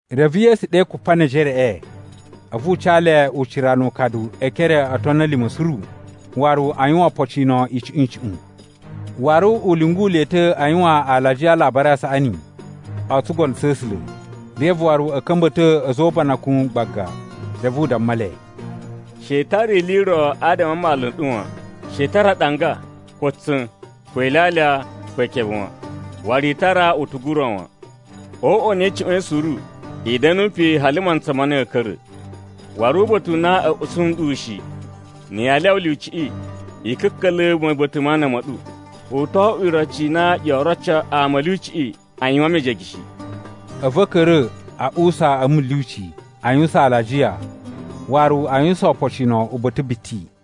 Reve Yesu ɗe Kupanejereꞌe, a̱vu u ca le ucira nu ukadu e ekere o otoni a̱ lima̱ suru, waru a yuwan opocino icuꞌun-icuꞌun. Waru u lyungu le ta̱ a yuwan alajiya a Alabari a Saꞌani o tsugono tsa̱ A̱sula̱, reve waru a̱ ka̱mba̱to a̱za̱ o ubanakun gbaga. Reve u damma le, “She i tara ili i ro adama a mmalu n ɗu wan; she i tara aɗanga, ko tsa̱n, ko ilyalya, ko ikebe wan. Waru i tara utugu u ro wan. O uꞌwa u na i cuꞌwain suru, i da̱nu pe hali mantsa ma na ya̱a̱ ka̱ra̱. Waru uba̱ta̱ u na a̱ usu nɗu shi, na̱ yaa lyawa lyuciꞌi, i ka̱ka̱la̱ ma̱buta̱ ma ana ma̱ ɗu. U to oꞌwo iroci i na yoo roco ama a̱ lyuciꞌi a yuwan mejege shi.” A̱vu a̱ ka̱ra̱ a uwusa a̱ mulyuci, a yuwusan alajiya, waru a yuwusan opocino uba̱ta̱ biti.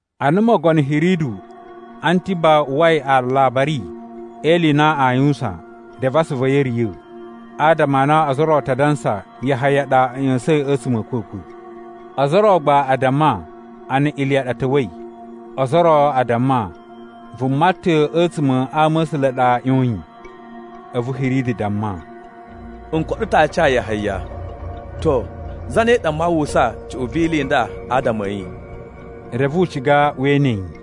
Ana mogono Hiridu Antiba uwwai alabari e ili i na aa yuwusan, reve asuvu a̱ yi a̱ riya̱, adama a na ozo o ro a ta dansa, Yahaya ɗa a̱ ꞌya̱sa̱in a̱tsuma̱ a̱ a̱kwa̱kwa̱. Ozo o ro gba a damma, ana Iliya ɗa ta̱wa̱i. Ozo o ro a damma, vuma ta̱ a̱tsuma̱ a ama̱sula̱ a ɗa ꞌyoyin. A̱vu Hiridu damma, “N koɗo ta̱ aaci a Yahaya. To, zane ɗa maa uwwusa cuꞌun vi ili i nda adama a̱ yi?” Reve u ciga we ene yi.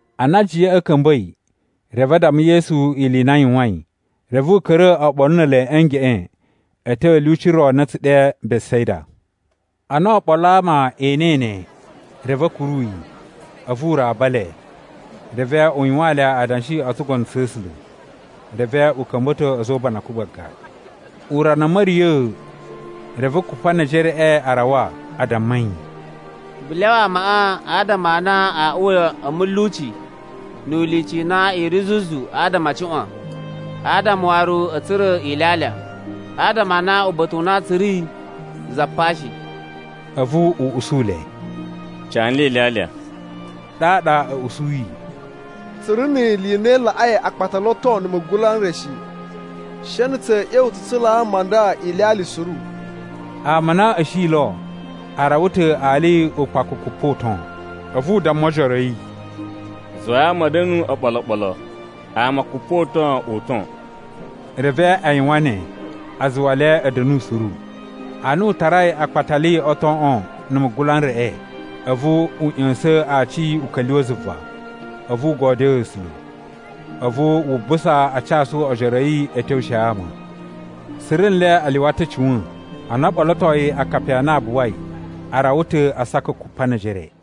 Ana ajiyaꞌa a̱ ka̱mba̱i, reve a damma Yesu ili i na a yuwain. Reve u ka̱ra̱ oɓolo ne ele a̱ ngeꞌen a̱ tyo a̱ lyuci ro na a̱ tsu ɗe Besaida. Ana oɓolo a ama e enei ne, reve a̱ kuru yi. A̱vu u raba le, reve u yuwaan le adanshi o tsugono tsa̱ A̱sula̱. Reve u ka̱mba̱to a̱za̱ o ubanakun gbaga. Urana a̱ ma̱riya̱a̱, reve Kupanejereꞌe a rawa a damma yi, “Vu lyawa amaꞌa adama a uwa a̱ mulyuci ni ilyuci i na i ri zuzu adama a cuꞌwan, adama waru a̱ tsura̱ ilyalya. Adama a na uba̱ta̱ u na tsu ri za pa shi.” A̱vu u usu le, “Ca nle ilyalya.” Ɗaɗa a̱ usuyi, “Tsu ri ni ili i na i laꞌai akpatali o ton na̱ mugula n re shi. She na̱ tsa̱a̱ ꞌya̱wa̱ tsu tsulaa ama a nda ilyalya suru.” (Ama a na a̱ shi lo a rawa ta̱ ali ukpakukupa uton.) A̱vu u damma ojoro a̱ yi, “Zuwai ama a̱ da̱nu oɓolo oɓolo, ama kupoton-uton.” Reve a yuwan ne, a zuwa le a̱ da̱nu suru. Ana u tarai akpatali o toꞌon na̱ mugula n reꞌe, a̱vu u ꞌya̱sa̱n aaci u ka̱lyuwa̱ zuva, a̱vu u godyoo A̱sula̱. A̱vu wu busa a casu ojoro a̱ yi a̱ tyowushe ama. Suru nle a lyuwa ta̱ a̱ cuwa̱n. Ana o ɓolotoi akapi a na a buwai, a rawa ta̱ asaka kupa ne ejere.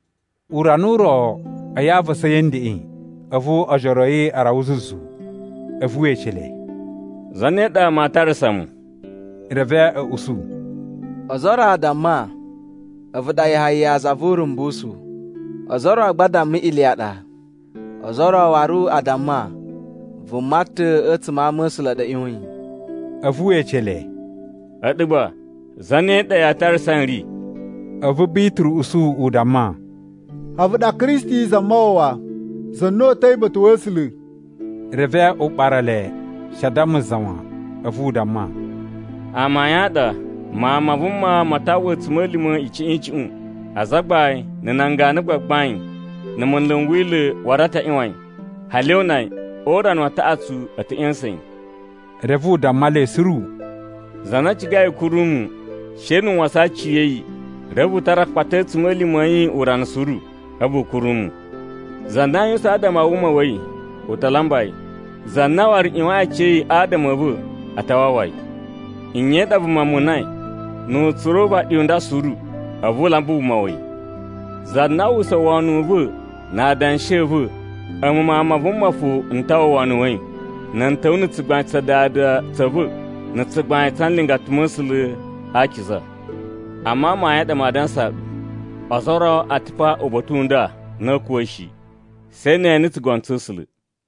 Urana u ro, a̱yi a avasa a̱yi a̱ ndeꞌen, a̱vu ojoro a̱ yi a rawa zuzu. A̱vu we ece le, “Zane ɗa ama aa tarasa mu?” Reve a̱ usu, “Ozo o ro a damma, a̱vu ɗa Yahaya za vu Urumbusu. Ozo o ro gba a damma Iliya ɗa. Ozo o ro waru a damma, vuma ta̱ a̱tsuma̱ a ama̱sula̱ a ɗa ꞌyoyin.” A̱vu we ece le, “A̱ɗu gba, zane ɗa yaa tarasa n ri?” A̱vu Bituru usu u damma, “A̱vu ɗa Kristi Zamawawa, za na uta̱i uba̱ta̱ wa̱ A̱sula̱.” Reve u ɓara le, she a damma za wan. A̱vu u damma, “Amayun a ɗa, Mawun ma Vuma ma ta uwwa a̱tsuma̱lima̱ icuꞌun-icuꞌun. Azagbain, na̱ nan ganu a gbagbain, na̱ munlu n Wila̱ waru a ta ꞌyuwan yi, hali o una yi. O urana wa taꞌatsu, a̱ ta̱ ꞌya̱sa̱n yi.” Reve u damma le suru, “Za na cigai u kuru mu, she nu u wasan aciya̱yi, reve u tara akpata a̱ a̱tsuma̱lima̱ a̱ yi urana suru, a̱vu u kuru mu. Za na a yuwusan adama a wuma wa̱ yi, u ta lamba yi. Za na waru ꞌyuwain aciya̱yi adama a̱ va̱, a ta wawa yi. Nye i ɗa vuma munai, nu u tsura̱ uvaɗi u nda suru, a̱vu u lamba wuma wa̱ yi? Za na aa uwwusa wono u va̱ na adanshi a̱ va̱, a̱mu Mawun ma Vuma fo n ta uwwa wono wa̱ yi, na̱ n ta̱wa̱ na̱ tsugbain tsa Dada tsa̱ va̱ na̱ tsugbain tsa nlingata ma̱ A̱sula̱ a akiza. Amma amayun a ɗa maa dansaa ɗu, ozo o ro a̱ ta̱ pa uba̱ta̱ u nda na a̱a̱ kuwa̱ shi, she ne e ene tsugono tsa̱ A̱sula̱.”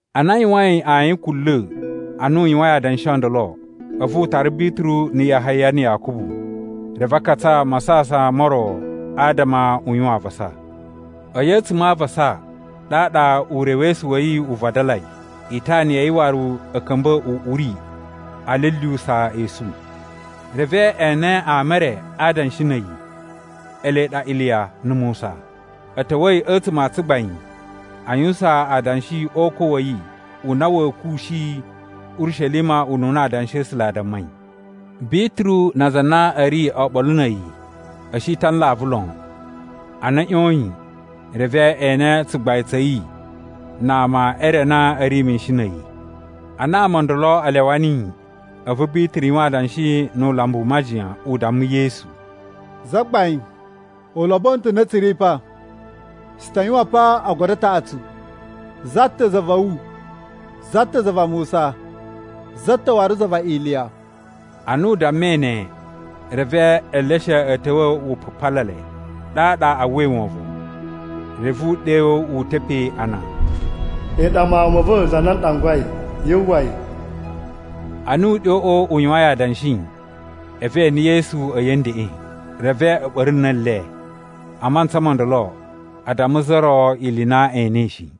Ana a yuwain ayin kunla̱, ana u yuwain adanshi o ndolo, a̱vu u tara Bituru na̱ Yahaya na̱ Yakubu. Reve a katsa masasan mo ro adama u yuwan avasa. A̱yi a̱tsuma̱ a avasa, ɗaɗa urewesu wa̱ yi u vadalai, itana ya̱ yi waru a̱ ka̱mba̱i uꞌuri a lyulyuwusa esu. Reve e ene ama e re a adanshi na̱ a̱yi, ele ɗa Iliya na̱ Musa. A̱ ta̱wa̱i a̱tsuma̱ a tsugbain a yuwusan adanshi o ukwa̱ wa̱ yi u na wa̱a̱ kuwushi Urishelima ununa Adanshi a̱ A̱sula̱ a dammai. Bituru na aza a na a̱ ri oɓolo na̱ a̱yi, a̱ shi ta̱ a nlavu lon. Ana a̱ ꞌyoyin, reve e ene tsugbain tsa̱ yi na ama e re ana a̱ ri mishin na̱ a̱yi. Ana ama o ndolo a lyawa niyi, a̱vu Bituru yuwan adanshi nu ulambu u majiyan, u damma Yesu, “Zagbain, u lobono ta̱ ana tsu ri pa. Tsu ta yuwan pa ogodo a taꞌatsu: za ta̱ za va̱ wu, za ta̱ za va Musa, za ta̱ waru za va Iliya.” Ana u dammai ne, reve eleshe a̱ ta̱wa̱ wu pupala le, ɗaɗa a uwwai wovon. Reve uɗyo wu uta̱ pe ana, “A̱yi ɗa Mawun ma̱ va̱ za na n ɗangwai. Yu uwwa yi.” Ana uɗyoꞌo u yuwain adanshi, a̱vu e ene Yesu a̱yi a̱ ndeꞌen. Reve a̱ ɓa̱ru na̱ le. A mantsa mo ndolo, a damma za ro ili i na e enei shi.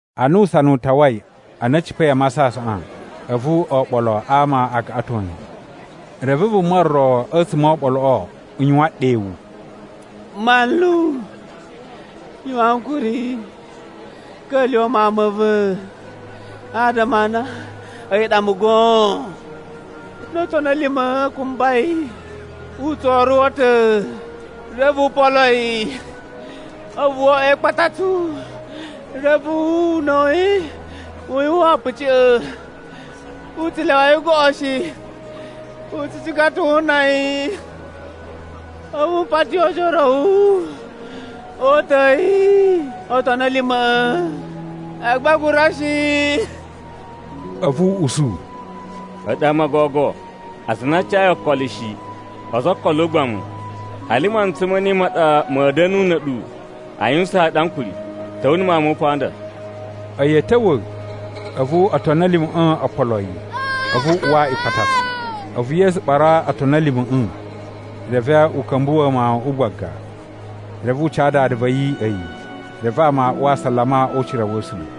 Ana usana u tawai, ana a̱ cipa̱i a masasaꞌan, a̱vu oɓolo a ama a gaꞌaton yi. Reve vuma ro a̱tsuma̱ o oɓoloꞌo u yuwan ɗewu, “Manlu, yuwan ankuri, ka̱lyuwa̱ mawun ma̱ va̱. Adama a na a̱yi ɗa mu goon. No otoni a̱ lima̱ a kumba yi, u tso oruwo ta̱. Reve u polo yi, a̱vu wo oꞌwo e ikpatatsu, reve una̱ wa̱ yi u yuwan a̱puciꞌya̱. U tsu lyawa yi goꞌo shi, u tsu ciga ta̱ wu una yi. A̱vu m pati ojoro a̱ wu o uta̱a̱ yi otoni a̱ lima̱ꞌa̱, agba a gura shi.” A̱vu u usu, “A̱ɗu ama o gogo, aza a na a cayi okolo shi, ozo o okolo o ugbamu; hali mantsa ma̱ ne ma̱a̱ da̱nu na̱ a̱ɗu a yuwusaan ɗu ankuri? Ta̱wa̱ na̱ mawun ma̱ wu pa nda.” A̱yi a̱ ta̱wa̱, a̱vu otoni a̱ lima̱ꞌa̱ o polo yi, a̱vu u uwa ikpatatsu. A̱vu Yesu ɓara otoni a̱ lima̱ꞌa̱, reve u ka̱mbuwa̱ mawuꞌun gbaga. Reve u ca dada va̱ yi a̱yi. Reve ama a uwa asalama o ucira wa̱ A̱sula̱.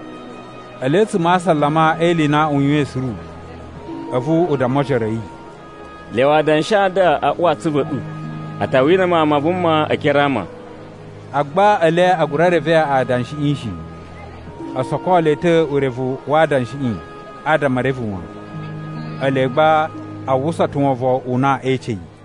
Ele a̱tsuma̱ a asalama e ili i na u yuwain suru, a̱vu u damma ojoro a̱ yi, “Lyawa adanshi a nda a uwa a atsuvu a̱ ɗu. A ta wina Mawun ma Vuma e ekere a ama.” Agba ele a gura reve adanshiꞌi shi. O soko le ta̱ urevu wa adanshiꞌi adama e reve wan. Ele gba a uwwusa ta̱ wovon u na ee ece yi.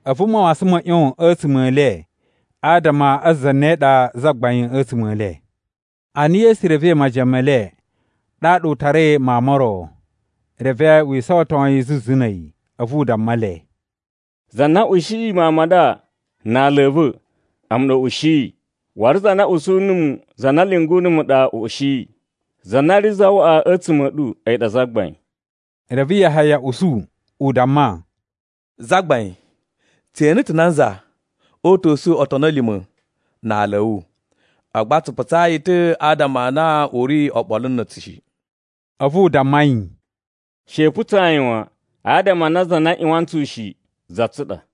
A̱vu mawasan ma̱ ꞌyon a̱tsuma̱ e le adama a zane ɗa zagbain a̱tsuma̱ e le. Ana Yesu revei majiyan me le, ɗaɗa u tarai mawun mo ro, reve wi isawaton yi zuzu na̱ a̱yi. A̱vu u damma le, “Za na ushiyi mawun ma nda na ala a̱ va̱, a̱mu ɗa u ushiyi. Waru za na usu numu, za na lyungu numu ɗa u ushiyi. Za na ri zawaꞌa a̱tsuma̱ a̱ ɗu, a̱yi ɗa zagbain.” Reve Yahaya usu, u damma, “Zagbain, tse ene ta̱ nanza o uta̱su otoni a̱ lima̱ na ala a̱ wu, agba tsu putsa yi ta̱ adama a na u ri oɓolo na̱ a̱tsu shi.” A̱vu u damma yi, “She i putsaa yi wan, adama a na za na ꞌyuwan tsu shi, za tsu ɗa.”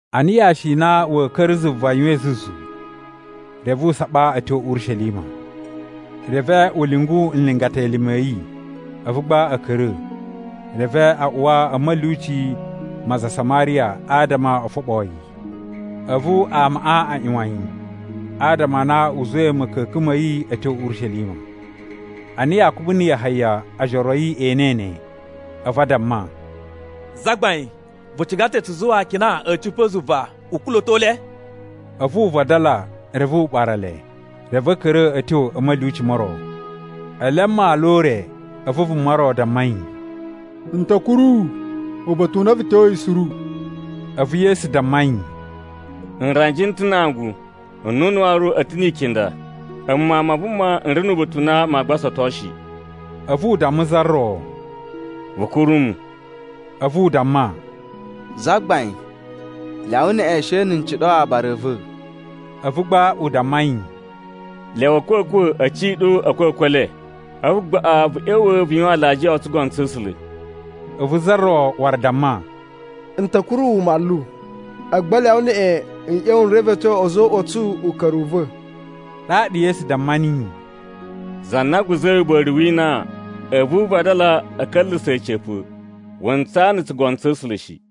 Ana yashi i na wa̱a̱ ka̱ra̱ zuva yuwain zuzu, reve u saɓa a̱ tyo Urishelima. Reve u lyungu nlingata elime a̱ yi. A̱vu gba a̱ ka̱ra̱, reve a uwa a̱ ma̱lyuci ma aza a Samariya adama o foɓoo yi. A̱vu amaꞌa a ꞌyuwan yi, adama a na u zuwai ma̱ka̱ka̱n ma̱ yi a̱ tyo Urishelima. Ana Yakubu na̱ Yahaya ojoro a̱ yi e enei ne, a̱vu a damma, “Zagbain, vu ciga ta̱ tsu zuwa akina a̱ cipa̱ zuva u kula̱to le?” A̱vu u vadala, reve u ɓara le. Reve a̱ ka̱ra̱ a̱ tyo a̱ ma̱lyuci mo ro. Ele a mmalu o ure, a̱vu vuma ro damma yi, “N ta̱ kuru wu uba̱ta̱ u na vu tyoyi suru.” A̱vu Yesu damma yi, “Nranji n ta̱ na angu; nnunu waru n ta̱ ni ikinda. A̱mu Mawun ma Vuma n ri nu uba̱ta̱ u na maa gbasato shi.” A̱vu u damma za ro, “Vu kuru mu.” A̱vu u damma, “Zagbain, lyawa neꞌen she na̱ n ciɗo aabara a̱ va̱.” A̱vu gba u damma yi, “Lyawa a̱kwa̱kwa̱ a̱ ciɗo a̱kwa̱kwa̱ e le. A̱vu gbaꞌa vu ꞌya̱wa̱ vu yuwan alajiya o tsugono tsa̱ A̱sula̱.” A̱vu za ro waru damma, “N ta̱ kuru wu manlu, agba lyawa neꞌen n ꞌya̱wa̱ n revetyo a̱za̱ o uꞌwa a̱ tsu uka̱ru u va̱.” Ɗaɗa Yesu damma niyi, “Za na guza̱i uba̱ri wi inan, a̱vu u vadala a̱ ka̱nla̱sa̱ a̱ca̱pa̱, wu ntsaa na̱ tsugono tsa̱ A̱sula̱ shi.”